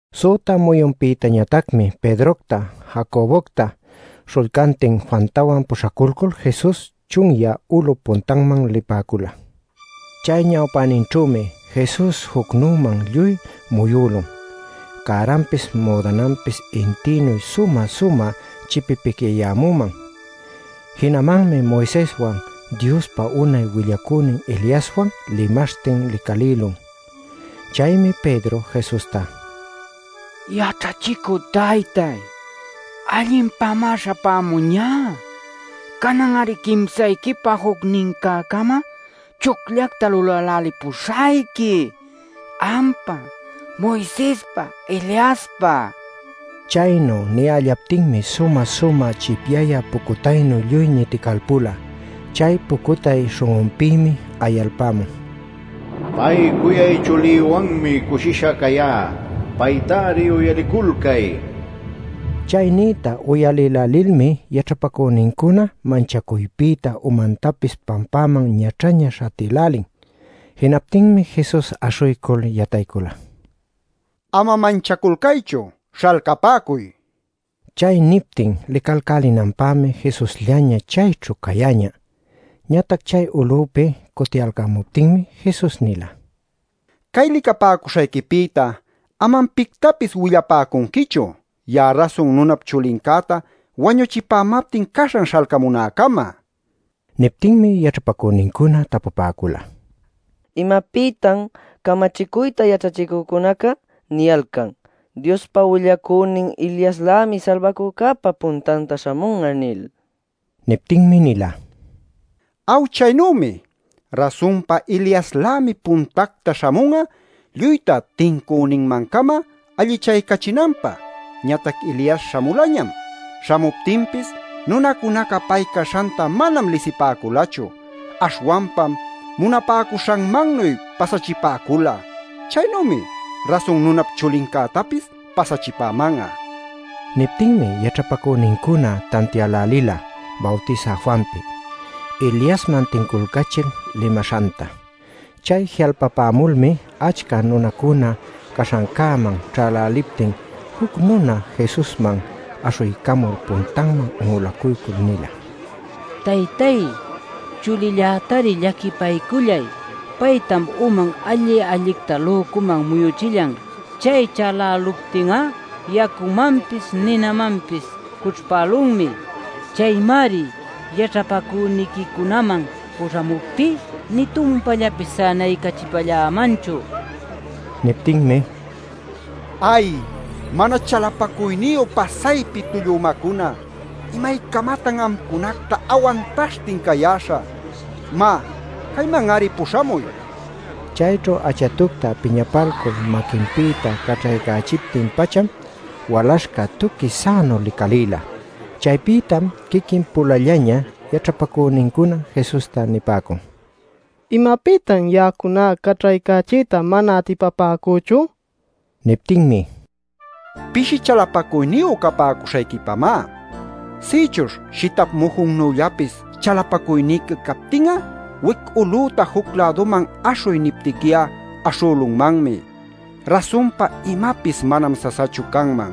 Süta muyunpïtañatacmi Pedrocta, Jacobocta, śhullcantin Juantawan puśhaculcul Jesus chunyä ulup puntanman lipäcula. Chay ñawpäninćhümi Jesus jucnüman lluy muyülun cäranpis müdananpis intïnu sumä-sumä chipipicyayämüman. Jinamanmi Moiseswan Diospa unay willacünin Eliaswan limaśhtin licalïlun. Chaymi Pedro Jesusta: “Yaćhachicü taytáy, allinpämá śhapämuñá. Canan-ari quimsayquipä jucnincä-cama chucllacta lulälälipuśhayqui, ampä, Moisespä, Eliaspä” nin. Chaynu niyällaptinmi sumä-sumä chipyayä pucutaynu lluy ñiticalpula. Chay pucutay śhun'unpïmi ayalpämun: “Pay cuyay chulïwanmi cushisha cayá. Paytari uyaliculcay” nil. Chay nïta uyalïlälilmi yaćhapacünincuna manchacuypïta umantapis pampaman ñaćhaña śhatïlälin. Jinaptinmi Jesus aśhuycul yataycula: “Ama manchaculcaychu. Śhalcapäcuy” nil. Chay niptin licalcälinanpämi Jesusllaña chayćhu cayäñä. Ñatac chay ulupi cutiyalcämuptinmi Jesus nila: “Cay licapäcuśhayquipïta amam pictapis willapäcunquichu, ya'a Rasun Nunap Chulincäta wañuchipämaptin caśhan śhalcamunäcama” nil. Niptinmi yaćhapacünincuna tapupäcula: “¿Imapïtan camachicuyta yaćhachicücunaca niyalcan ‘Diospa willacünin Eliaslämi Salbacücäpa puntanta śhamun'a’ nil?” Niptinmi nila: “Aw chaynümi. Rasunpa Eliaslämi puntacta śhamun'a lluyta tincüninmancama allichaycachinanpä. Ñatac Elias śhamulañam. Śhamuptinpis nunacunaca pay caśhanta manam lisipäculachu. Aśhwanpam munapäcuśhanmannuy pasachipäcula. Chaynümi Rasun Nunap Chulincätapis pasachipäman'a” nil. Niptinmi yaćhapacünincuna tantiälälila Bawtisä Juanpi, Eliasman tinculcachil limaśhanta. Chay ji'alpapämulmi achca nunacuna caśhancäman ćhäläliptin juc nuna Jesusman aśhuycamul puntanman un'ulacuycul nila: “Taytay, chulillätari llaquipaycullay. Paytam uman alli-allicta lücuman muyuchillan. Chay chaläluptin'a yacumanpis ninamanpis cućhpälunmi. Chaymari yaćhapacüniquicunaman puśhamuptí nï tumpallapis sänaycachipällämanchu” nil. Niptinmi: “¡Ay, mana chalapacuyniyu pasaypi tullu umacuna! ¿Imaycamatan amcunacta awantaśhtin cayäśhä? Má, cayman-ari puśhamuy” nin. Chayćhu achatucta piñapalcul maquinpïta caćhaycachiptin-pacham walaśhca tuqui sänu licalïla. Chaypïtam quiquin-pulallaña yaćhapacünincuna Jesusta nipäcun: “¿Imapïtan ya'acuna caćhaycachiyta mana atipapäcüchu?” nil. Niptinmi: “Pishi chalapacuyniyu capäcuśhayquipamá. Sïchuśh shitap mujunnüllapis chalapacuyniqui captin'a, wic ulüta juc-läduman ‘aśhuy’ niptiqui'a, aśhülunmanmi. Rasunpa imapis manam sasachu canman.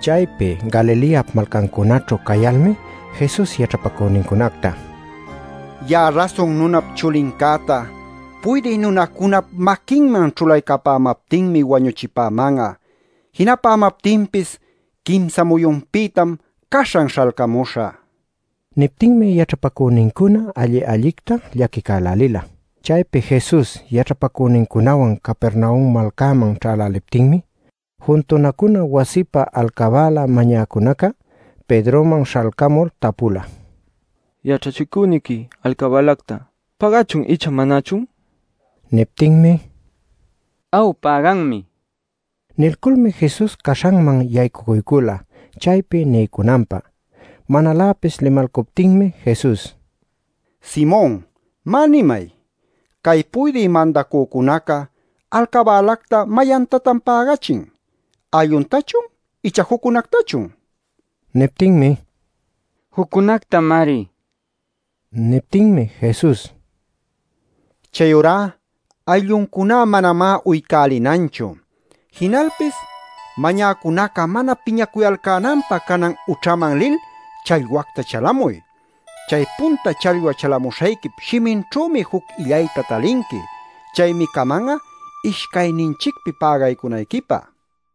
Chaypi Galileap malcancunaćhu cayalmi Jesus yaćhapacünincunacta: “Ya'a Rasun Nunap Chulincäta puydï nunacunap maquinman ćhulaycamaptinmi wañuchipäman'a. Jinapämaptinpis quimsa muyunpïtam caśhan śhalcamuśhä” nin. Niptinmi yaćhapacünincuna alli-allicta llaquicälälila. Chaypi Jesus yaćhapacünincunawan Capernaum malcäman ćhäläliptinmi juntunacuna wasipä alcabäla mañäcunaca Pedroman śhalcamul tapula: “Yaćhachicüniqui alcabälacta ¿päganchun icha manachun?” nil. Niptinmi: “Aw, päganmi” nin. Nilculmi Jesus caśhanman yaycucuycula chaypi niycunanpä. Manaläpis limalcuptinmi Jesus: “Simon, má, nimay. Cay puydï mandacücunaca alcabälacta ¿mayantatan pägachin? ¿Aylluntachun icha juccunactachun?” nin. Niptinmi: “Juccunactamari” nin. Niptinmi Jesus: “Chayurá aylluncuná manamá uycälinanchu. Jinalpis mañäcunaca mana piñacuyalcänanpä canan ućhaman lil challwacta chalamuy. Chay punta challwa chalamuśhayquip shiminćhümi juc illayta talinqui. Chaymi caman'a ishcayninchicpi pägaycunayquipä” nin.